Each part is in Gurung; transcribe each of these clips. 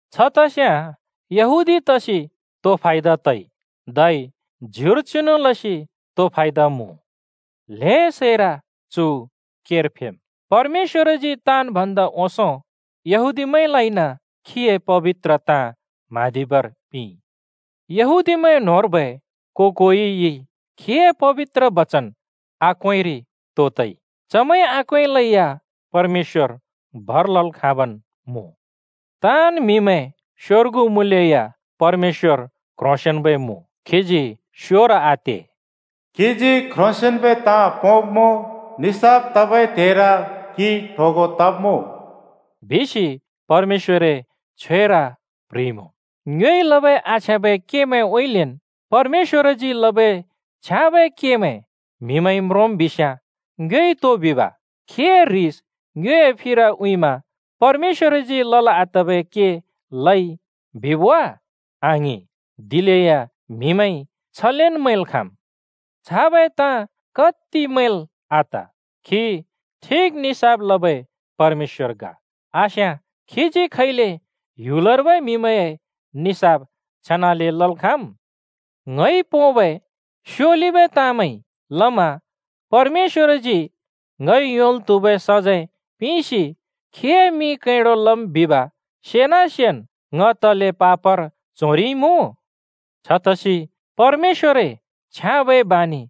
छ तस्‍याँ यहूदी तसि तो फायदा तइ दि? धै ज्युर चिनु लसि तो फायदा मुँ? ल्हें सैर चु केर फेम्! परमेश्‍वरजी ताँन् भन्दा ओंसों यहूदीमैंलाइन खीए पबित्र ताँ म्हाँदिबर पिंइ। यहूदीमैं न्होंर्बै को-कोइइ खीए पबित्र बचन आक्वेंरि तो तइ दि? चमैंइ आक्वेंलै या परमेश्‍वर भर लल् खाँबन् मुँ। ताँन् म्‍हिमैं स्‍योर्गु मुँलेया परमेश्‍वर क्ह्रोंसेंन्बै मुँ, खीजी स्योर आते। “क्‍हिजी क्ह्रोंसेंन्बै ताँ पोंमुँ, निसाफ तबै त्हेर क्‍हि ट्होगों तब्‍मुँ,” बिसि परमेश्‍वरए छ्वेर प्ह्रिइमुँ। ङ्योइ लबै आछ्याँबै केमैंउँइँलेन् परमेश्‍वरजी लबै छ्याँबै केमैं म्हिमैंइ म्रोंम् बिस्याँ ङ्योइ तो बिब् दि? “खीए ह्रिस ङ्योए फिर उँइँमा परमेश्‍वरजी लल् आतबै के लइ!” बिब् वा? आङिं! (दिलेया म्हिमैंइ छलेन मैंल् खाँम्।) छाबै ताँ कत्ति मैंल् आत! खी ठिक निसाफ लबै परमेश्‍वर ग! आस्याँ खीजी खैले ह्‍युलर्बै म्हिमैंए निसाफ छेनाले लल् खाँम्? “ङइ लबै स्‍योलिबै ताँमैंइ लमा परमेश्‍वरजी ङइ योंल् त्हुबै सजैं पिंसि खीए मिं कैंडों लम् बिब सेना-सेन् ङ तले पापर च्होरिइमुँ?” छतसि “परमेश्‍वरए छ्याँबै बानि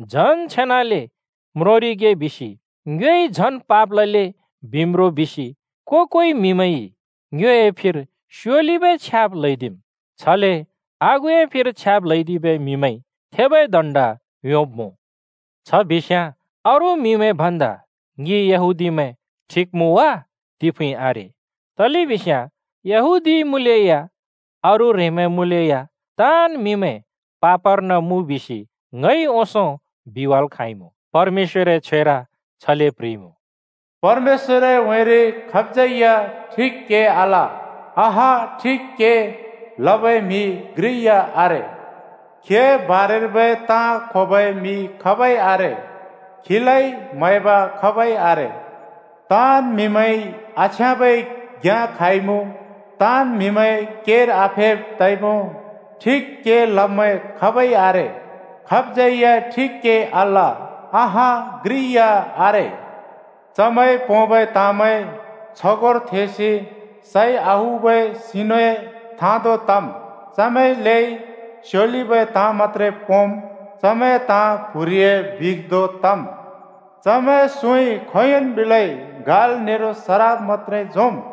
झन् छेनाले म्रोंरिगे बिसि ङ्योइ झन् पाप लले।” बिम् रो बिसि को-कोइ म्‍हिमैंइ ङ्योए फिर स्योलिबै छ्याब् ल्‍हैदिम्। छले आगुए फिर छ्याब् ल्हैदिबै म्हिमैंइ थेबै दण्ड योंब्मुँ। छ बिस्‍याँ अरू म्हिमैं भन्दा ङि यहूदीमैं ठिक मुँ वा? तिफुँइ आरे! तलेबिस्याँ यहूदी मुँलेया अरू ह्रेंमैं मुँलेया ताँन् म्हिमैं पापर्न मुँ बिसि ङइ ओंसों बिवाल् खाँइमुँ। परमेश्‍वरए छ्वेर छले प्ह्रिइमुँ: “परमेश्‍वरए उँइँरि खाबज्यै या ठिक के आल, अँहँ ठिक के लबै म्हि घ्रि या आरे। खीए बारेर्बै ताँ क्‍होबै म्‍हि खाबै आरे, खीलाइ म्हैब खाबै आरे। ताँन् म्हिमैंइ आछ्याँबै घ्‍याँ क्हाइमुँ, ताँन् म्‍हिमैं केर आफेब् तइमुँ। ठिक के लब्मैं खाबै आरे, खाबज्यै ठिक के आल, अँहँ घ्रि या आरे। चमैंइ पोंबै ताँमैं छगोंर थेंसि सइ आउबै सिनुए थाँ धों तम्। चमैंए लेइ स्‍योलिबै ताँ मत्‍त्रे पोंम्, चमैंए ताँ प्‍हुरिए बिख धों तम्। चमैंए सुँइ खोंयोंन् बिलै गाल् नेरो सराप मत्‍त्रे झोंम्।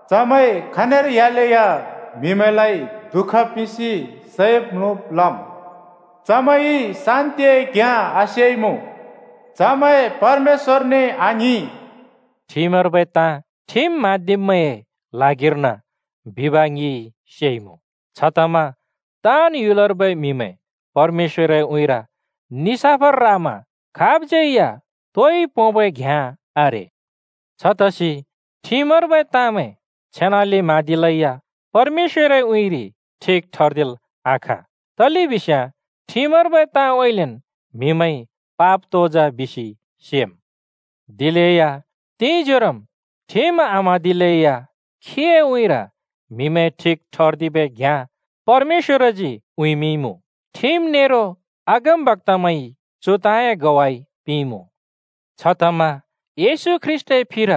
चमैं खनिर ह्‍यालेया म्‍हिमैंलाइ दुःख पिंसि सैब् म्‍लुब् लम्। चमैंइ शान्‍तिए घ्‍याँ आसेइमुँ। चमैं परमेश्‍वरने आङ्हिं।” ठिमर्बै ताँ ठिम म्हाँदिब्मैंए ल्हागिर्न बिब ङिइ सेइमुँ। छतमा ताँन् ह्‍युलर्बै म्‍हिमैं परमेश्‍वरए उँइँर निसाफर रामा खाबज्‍यै या तोइ पोंबै घ्‍याँ आरे। छतसि ठिमर्बै ताँमैं छेनाले म्हाँदिलै या परमेश्‍वरए उँइँरि ठिक ठर्दिल् आखाँ। तलेबिस्याँ ठिमर्बै ताँउँइँलेन् म्‍हिमैंइ पाप तो जा बिसि सेम्। दिलेया तिंजोरोम् ठिम आम्हाँदिलैया खीए उँइँर म्हिमैं ठिक ठर्दिबै घ्‍याँ परमेश्‍वरजी उँइँमिंइमुँ। ठिम नेरो अगमबक्‍तामैंइ चु ताँए ग्वाइ पिंइमुँ। छतमा येशू ख्रीष्‍टए फिर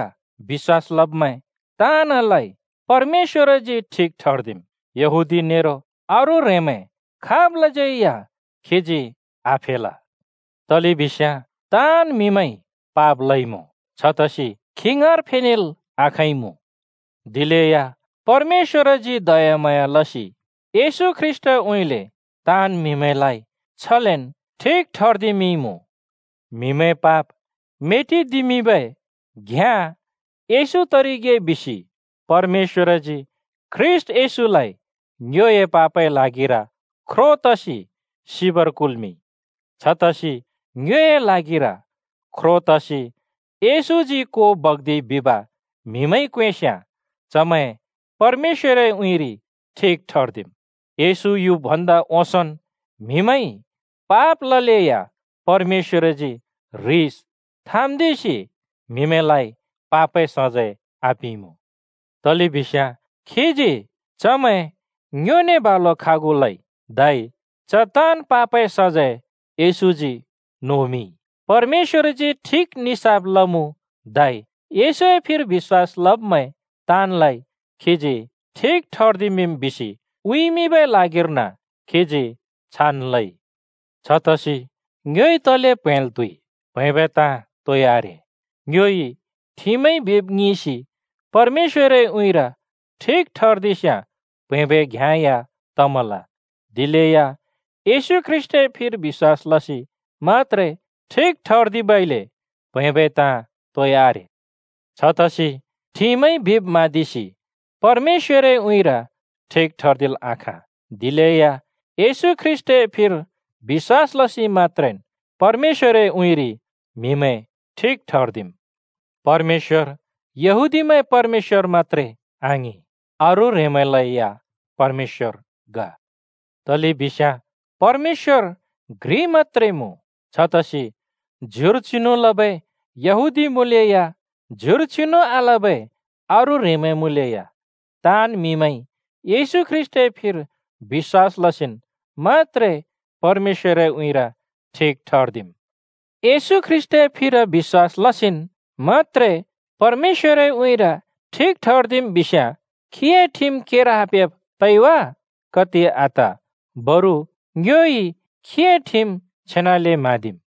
बिश्‍वास लब्मैं ताँनलाइ परमेश्‍वरजी ठिक ठर्दिम्। यहूदी नेरो अरू ह्रेंमैं खाबलाज्यै या खीजी आफेल। तलेबिस्याँ ताँन् म्‍हिइ पाप लइमुँ, छतसि खी ङाँर फेनेल् आखाँइमुँ। दिलेया परमेश्‍वरजी दयाम्हाँया लसि येशू ख्रीष्‍टउँइँले ताँन् म्हिलाइ छलेन् ठिक ठर्दिमिंइमुँ। म्‍हिमैंए पाप मेटिदिमिंबै घ्‍याँ येशू तरिगे बिसि परमेश्‍वरजी ख्रीष्‍ट येशूलाइ ङ्योए पापए ल्हागिर ख्रो तसि सिबर कुल्मिंइ। छतसि ङ्योए ल्हागिर ख्रो तसि येशूजी को बग्दिइ बिब म्‍हिमैंइ क्वेंस्याँ चमैं परमेश्‍वरए उँइँरि ठिक ठर्दिम्। येशू युब् भन्दा ओंसोंन् म्हिमैंइ पाप ललेया परमेश्‍वरजी ह्रिस थाँम्‍दिसि म्‍हिमैंलाइ पापए सजैं आपिंइमुँ, तलेबिस्याँ खीजी चमैं ङ्योने बालु खागु लइ, धै च ताँन् पापए सजैं येशूजी नोमिंइ। परमेश्‍वरजी ठिक निसाफ लमुँ धै येशूए फिर बिश्‍वास लब्मैं ताँनलाइ खीजी ठिक ठर्दिमिंम् बिसि उँइँमिंबै ल्हागिर्न खीजी छान् लइ। छतसि ङ्योइ तले प्हैंल् त्हुइ? प्‍हैंबै ताँ तोइ आरे। ङ्योइ ठिमइ बिब् ङिंसि परमेश्‍वरए उँइँर ठिक ठर्दिस्‍याँ प्‍हैंबै घ्याँ या तमल, दिलेया येशू ख्रीष्‍टए फिर बिश्‍वास लसि मत्‍त्रे ठिक ठर्दिबइले प्‍हैंबै ताँ तोइ आरे। छतसि ठिमइ बिब् म्हाँदिसि परमेश्‍वरए उँइँर ठिक ठर्दिल् आखाँ, दिलेया येशू ख्रीष्‍टए फिर बिश्‍वास लसि मत्‍त्रेन् परमेश्‍वरए उँइँरि म्‍हिमैं ठिक ठर्दिम्। परमेश्‍वर यहूदीमैंए परमेश्‍वर मत्‍त्रे आङिं। अरू ह्रेंमैंलैया परमेश्‍वर ग। तलेबिस्याँ परमेश्‍वर घ्रि मत्‍त्रे मुँ। छतसि ज्युर चिनु लबै यहूदी मुँलेया, ज्युर चिनु आलबै अरू ह्रेंमैं मुँलेया, ताँन् म्‍हिमैंइ येशू ख्रीष्‍टए फिर बिश्‍वास लसिन् मत्‍त्रे परमेश्‍वरए उँइँर ठिक ठर्दिम्। येशू ख्रीष्‍टए फिर बिश्‍वास लसिन् मत्‍त्रे परमेश्‍वरए उँइँर ठिक ठर्दिम् बिस्याँ खीए ठिम केर आफेब तइ वा? कत्ति आत! बरु ङ्योइ खीए ठिम छेनाले म्हाँदिम्।